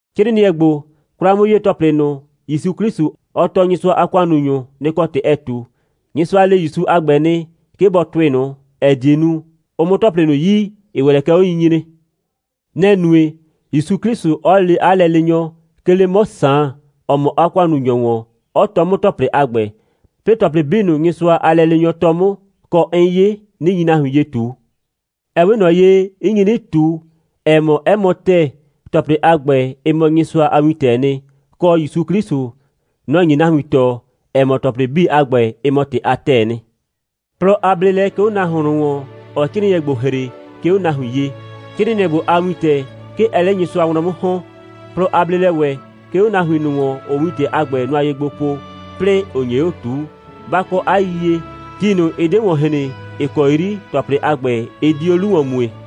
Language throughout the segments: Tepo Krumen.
'Crɩɩnɩɛ ‑gbo, 'kwla'mʋ'yee‑tɔplɩ ꞊nʋ, ‑Yusu 'Klɩsʋ, ɔ tɔɔ Nyɩsʋa a ‑kʋannunyʋ, nɩ‑ kɔ ‑tɩ ɛɛ ꞊tu. Nyɩsʋa le ‑Yusu a ‑gbɛ nɩ, 'ke bɔ tʋɩ ꞊nʋ, ‑ɛ die nu, ʋ 'mʋ ‑tɔplɩ ꞊nʋ yi, ‑ɩ ‑wɛ lɛ kɛ 'onyinyre. Nɛ‑ nue, ‑Yusu 'Klɩsʋ 'ɔ lee 'a lɛleenyɔ, 'ke 'le 'mɔ Saan, ‑ɔ mɔ 'a ‑kʋannunyɔ ‑wɔn, 'ɔ tɔɔ 'mʋ ‑tɔplɩ a ‑gbɛ, 'plɩɩ ‑tɔplɩ 'bii ꞊nʋ, Nyɩsʋa a lɛleenyɔ tɔɔ 'mʋ, kɔ, 'n 'ye, 'nɩ nyi nahuin ye ꞊tu. Ɛ 'we ꞊nɔ ye, 'n nyi 'nɩ ꞊tu, ‑ɛ mɔ, 'ɛ mɔ ‑tɛɛ, ‑tɔplɩ a ‑gbɛ, ɩ mɔ Nyɩsʋa a wintɛɛ nɩ, kɔ, ‑Yusu 'Klɩsʋ, nɔ‑ nye nahuin tɔɔ, ‑ɛ mɔ, ‑tɔplɩ 'bii a ‑gbɛ, ɩ mɔ ‑tɩ a ‑tɛɛ nɩ. Plɔ a bleelɛ 'ke 'o nahuon ꞊nʋ ‑wɔn, ‑ɔɔ 'crɩɩnɩɛ ‑gbo ‑hre, 'ke 'o nahuin ye. 'Crɩɩnɩɛ ‑gbo a wintɛ, 'ke ɛɛ 'le Nyɩsʋa wlɔn 'mʋ ‑hɔn. Plɔ a bleelɛ ‑wɛ, 'ke 'o nahuin ꞊nʋ ‑wɔn, ‑ʋʋ wintɛ a ‑gbɛ nʋa ye gbo po, 'plɩɩ ‑ʋ nye 'o ꞊tuu. Ba kɔ 'a yiyie, ti ꞊nʋ, ɩ 'de ‑wɔn hren, ‑ɩ kɔ 'yri ‑tɔplɩ a ‑gbɛ, ɩ di 'o 'lu ‑wɔn mue.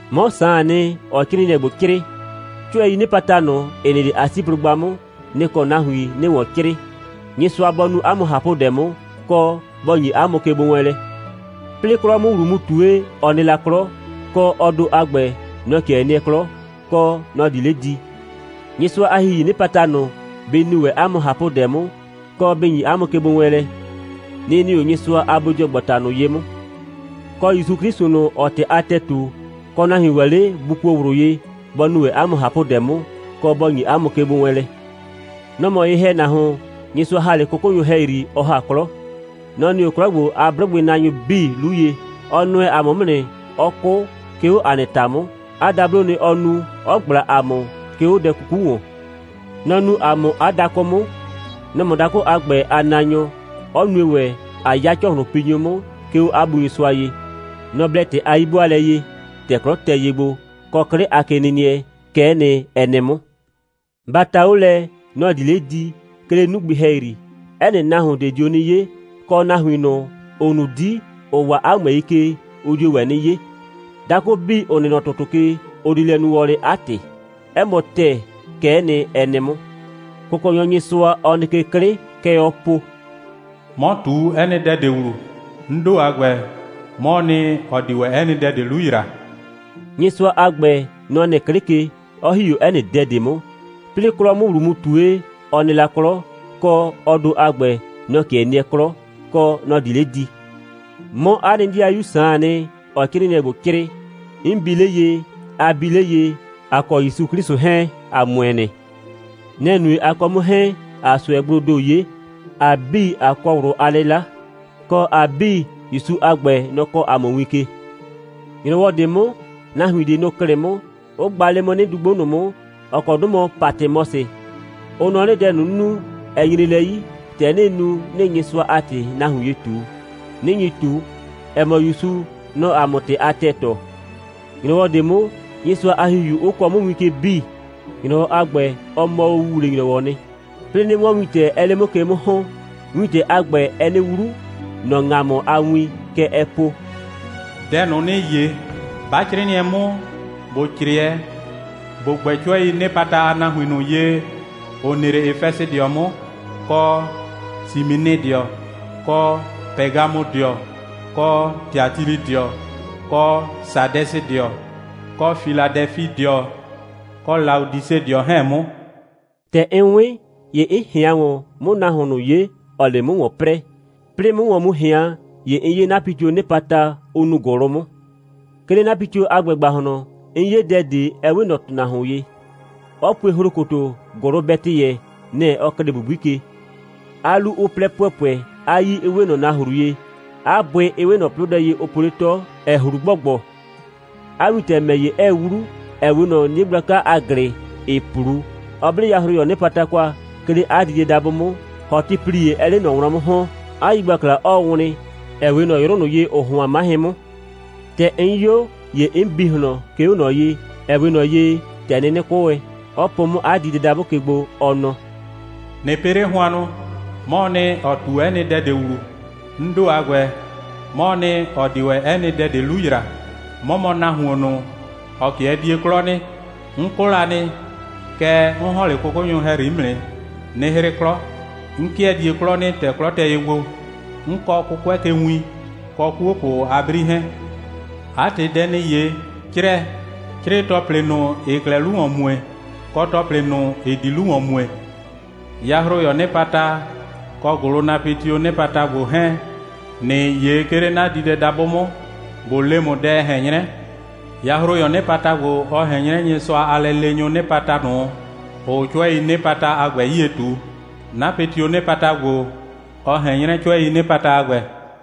'Mɔ Saan nɩ, ‑ɔɔ 'crɩɩnɩɛ ‑gbo 'crɩɩ. 'Cʋɛii 'nɩpata ꞊nʋ, ‑ɩ nɩ 'le Asiblʋgba 'mʋ, nɩ‑ kɔ nahuin 'nɩɩ ‑wɔn 'crɩɩ. Nyɩsʋa bɔ nu 'a mʋ ꞊hapʋdɛ 'mʋ, kɔ, bɔ ‑nyi 'a mʋ kegbowɛɛnlɛ. 'Plɩɩ 'klɔ 'mʋ ‑wlu mu ꞊tue, ɔ nɩ la 'klɔ, kɔ, ɔ ‑do a ‑gbɛ, nɔ‑ 'kɩɛ nɩɛ 'klɔ, kɔ, nɔ‑ di 'le di. Nyɩsʋa a ‑Hihii 'nɩpataf1 ꞊nʋ, bɩ nu ‑wɛ 'a mʋ ꞊hapʋdɛ 'mʋ, kɔ bɩ ‑nyi 'a mʋ kegbowɛɛnlɛ. Nɩ‑ nɩ 'o Nyɩsʋa a bodɩɔgbata ꞊nʋ ye 'mʋ. Kɔ, ‑Yusu 'Klɩsʋ ꞊nʋ, ‑ɔɔ ‑tɩ a ‑tɛɛ ꞊tu, kɔ, nahuin ‑wɛ 'le ‑bʋ kuo ꞊wlʋ ye, bɔ nu ‑wɛ 'a mʋ ꞊hapʋdɛ 'mʋ, kɔ, bɔ ‑nyi 'a mʋ kegbowɛɛnlɛ. Nɔ‑ mɔ ye‑hɛnahuon, Nyɩsʋa ‑ha 'le 'kʋkʋnyʋ ‑hɛyri, ɔ ‑ha 'klɔ. Nɔ‑ nɩ 'o 'klɔ ‑gbo a 'blʋgbɩnaanyʋ 'bii 'lu ye. Ɔ nʋɛ ‑a mʋ 'mʋ nɩ, 'ɔ 'kʋ, 'ke 'o ‑a nɩ ‑ta 'mʋ. 'A dabloo nɩ, ɔ nu, 'ɔ ꞊gbla ‑a mʋ, 'ke 'o dɛ 'kuku ‑wɔn. Nɔ‑ nuu ‑a mʋ 'a dakʋ 'mʋ. Nɔ‑ mɔ dakʋ a ‑gbɛ a naanyɔ, 'ɔ nue ‑wɛ, ꞊a 'ya ‑cɔhlʋnpinyʋ 'mʋ, 'ke 'o 'a Bu Nyɩsʋa ye. Nɔ‑ blɛ ‑tɩ a 'yi'bʋaalɛ ye, ‑tɛ 'klɔ tɛ ye gbo, kɔ 'klɩ a kenɩnɩɛ. Kɛ'ɛ nɩ, ɛ nɩ 'mʋ. Ba ta 'o lɛ, nɔ‑ di 'le di, 'ke 'le 'nugbɩ ‑hɛyri. 'Ɛ nɩ nahuon ꞊de dio 'nɩ 'ye, kɔ, nahuin ꞊nʋ, ‑ʋ nu 'di, ‑ʋ waa 'a ꞊mʋɛi ke, ʋ dio ‑wɛ 'nɩ 'ye. Dakʋ 'bii, ‑ʋ nɩ nɔ ‑tʋtʋ ke, ʋ di lɛ nu wɔlɩ 'a ‑tɩ. 'Ɛ mɔ ‑tɛɛ, kɛ'ɛ nɩ, ɛ nɩ 'mʋ. Kʋkɔnyɔ Nyɩsʋa, ‑ɔ nɩ 'klɩ ke, kɛ ɔɔ po: «'Mɔ ꞊tu 'ɛ nɩ dɛ ꞊de ‑wlu. 'N ‑do a ‑gbɛ, 'mɔɔ nɩ, ‑ɔ di ‑wɛ 'ɛ nɩ dɛ ꞊de 'lu ‑yra.» Nyɩsʋa a ‑gbɛ, nɔ‑ nɩ 'klɩ ke, 'ɔ ‑hi 'o 'ɛ nɩ dɛ ꞊de 'mʋ. 'Plɩɩ 'klɔ 'mʋ ‑wlu mu ꞊tue, ɔ nɩ la 'klɔ, kɔ, ɔ ‑do a ‑gbɛ, nɔ‑ 'kɩɛ nɩɛ 'klɔ, kɔ, nɔ‑ di 'le di. 'Mɔ mɔ 'a nɩ ‑dɩayu Saan nɩ, ‑ɔɔ 'crɩɩnɩɛ ‑gbo 'crɩɩ. 'N bi 'le ye, a bi 'le ye, ‑a kɔ ‑Yusu 'Klɩsʋ 'hɛɛn, ‑a ‑mʋɛ nɩ. Nɛ‑ nue, a kɔ 'mʋ 'hɛɛn, ꞊aa ꞊sʋɛgbloo ‑do 'ye, ‑a 'bii, ꞊a kɔ ꞊wlʋ a 'lɩla, kɔ, ‑a 'bii, ‑Yusu a ‑gbɛ, nɔ‑ kɔɔ ‑a mʋ win ke. ‑Nyrɔwɔ ꞊de 'mʋ, nahuin ꞊de, nʋ‑ klɩ 'mʋ, 'ʋ gba 'le 'mʋ 'nɩdugbo ꞊nʋ 'mʋ, ‑ɔ kɔ 'dʋ mɔ Patɩmɔsɩ. Ʋ nɔ 'nɩ, dɛ ꞊nʋ, 'n nu, ɛ nyre lɛ 'yi, ‑tɛ 'nɩɩ nu, 'nɩɩ Nyɩsʋa a ‑tɩ nahuin ye ꞊tu, 'nɩ nyi ꞊tu, ‑ɛ mɔ, ‑Yusu, nɔ‑ɔ ‑a mʋ ‑tɩ a ‑tɛɛ tɔɔ. ‑Nyrɔwɔ ꞊de 'mʋ, Nyɩsʋa a ‑Hihiu 'ʋ kɔɔ 'mʋ win ke 'bii. ‑Nyrɔwɔ a ‑gbɛ, ɔ mɔ o ‑wuwle‑nyrɔwɔ'ɔ nɩ; 'plɩɩ 'nɩ 'wɔn wintɛ, 'ɛɛ 'le 'mʋ ke 'mʋ ‑hɔn. Wintɛ a ‑gbɛ, ɛɛ 'nɩ 'wlu, ‑nɔ ‑ŋamʋ a win. Kɛ ɛɛ po: «Dɛ ꞊nʋ, ‑nɩɩ 'ye, 'ba 'crɩɩnɩɛ 'mʋ, ‑bo 'crɩɛ, ‑bo gbɛ 'cʋɛii 'nɩpata a nahuin ꞊nʋ ye, ‑ʋ nɩ 'le Efɛsɩdɩɔ 'mʋ, kɔ Siminɩdɩɔ, kɔ Pɛgamʋdɩɔ, kɔ Tiatilɩdɩɔ, kɔ Sadɛsɩdɩɔ, kɔ Filadɛfidɩɔ, kɔ Laodisedɩɔ 'hɛɛn 'mʋ.» ‑Tɛ 'n 'wɩn, ‑ye 'n ꞊hɩan ‑wɔn, 'mʋ nahuon ꞊nʋ 'ye, ‑ɔɔ 'le 'mʋ ‑wɔn 'prɛɛ. 'Plɩɩ 'mʋ ‑wɔn mu ꞊hɩan, ‑ye 'n 'ye 'napɩtioo 'nɩpata, ʋ nuu ‑gʋlʋ 'mʋ. 'Ke 'le 'napɩtio a ‑gbɛ ‑gbahlɔn, 'n 'ye dɛ ꞊de, ‑ɛ 'we ꞊nɔ ‑tʋnahuon ye, 'ɔ pue ‑hlokoto, ‑gʋlʋbɛtɩyɛ, nɛ‑ ɔ klɩɩ ‑bubui ke, 'a 'lu 'ʋ 'plɛ ‑pʋɛpʋɛ, 'a 'yii 'ɩ 'we ꞊nɔ nahru ye, 'a bʋɩ 'ɩ 'we ꞊nɔ 'plʋdɛ ye, ʋ po 'le 'tɔ, ‑ɛ ꞊hlu ‑gbɔgbɔ; 'a wintɛ ‑mɛ ‑ye, 'ɛɛ 'wlu, ‑ɛ 'we ꞊nɔ 'nie gblaka a ‑glɩ, ‑ɩɩ 'plu, 'ɔ 'ble yahroyɔɔ 'nɩpata kwa, 'ke 'le 'a diidɛdabʋ 'mʋ, ‑hɔtɩplie 'ɛɛ 'le ꞊nɔ wlɔn 'mʋ ‑hɔn, 'a yigbakla 'ɔɔ wlɩn, ‑ɛ 'we ꞊nɔ 'yrʋ ꞊nʋ ye, ‑ʋʋ hʋan, 'mahɩn 'mʋ. ‑Tɛ 'n 'yo, ‑ye 'n bi ꞊hlɔn, 'ke 'o ꞊nɔ ye, ‑ɛ 'we ꞊nɔ ye, ‑tɛ 'nɩnɩ 'kʋ wɛn, 'ɔ po 'mʋ 'a diidɛdabʋ ke gbo, ɔ nɔ: «꞊Nɩ pɩ 'le hʋannʋ. 'Mɔɔ nɩ, ‑ɔ ꞊tu 'ɛ nɩ dɛ ꞊de ‑wlu, 'n ‑do a ‑gbɛ, 'mɔɔ nɩ, ‑ɔ di ‑wɛ 'ɛ nɩ dɛ ꞊de 'lu ‑yra. 'Mɔ mɔ nahuon ꞊nʋ, ‑ɔ 'kɩɛ die 'klɔ nɩ. 'N 'kʋ la nɩ, kɛɛ, 'n ‑hɔn 'le 'kʋkʋnyʋ ‑hɛyri 'mʋ nɩ, 'nɩ 'hrɩ 'klɔ. 'N 'kɩɛ die 'klɔ nɩ, ‑tɛ 'klɔ tɛ ye gbo. 'N kɔɔ 'kʋkʋɛ ke win, kɔ 'kuopʋ a 'bri 'hɛɛn. 'A ‑tɩ, dɛ ‑nɩɩ 'ye, 'crɛɛ. 'Crɩɩ ‑tɔplɩ ꞊nʋ, ‑ɩɩ 'klɛɛ 'lu ‑wɔn mue, kɔ ‑tɔplɩ ꞊nʋ, ‑ɩ di 'lu ‑wɔn mue. Yahroyɔɔ 'nɩpata kɔ ‑gʋlʋnapɩtioo 'nɩpata ‑gbo 'hɛɛn, ‑nɩɩ 'ye, 'ke 'le 'na diidɛdabʋ 'mʋ, ꞊bo le ‑mʋ, dɛ ɛ ꞊hɛn 'nyrɛ. Yahroyɔɔ 'nɩpata ‑gbo, ɔ ꞊hɛn 'nyrɛ Nyɩsʋa a lɛleenyʋʋ 'nɩpata ꞊nʋ, ‑ʋʋ 'cʋɛii 'nɩpata a ‑gbɛ 'yie ꞊tu. 'Napɩtioo 'nɩpata ‑gbo, ɔ ꞊hɛn 'nyrɛ 'cʋɛii 'nɩpata a ‑gbɛ.»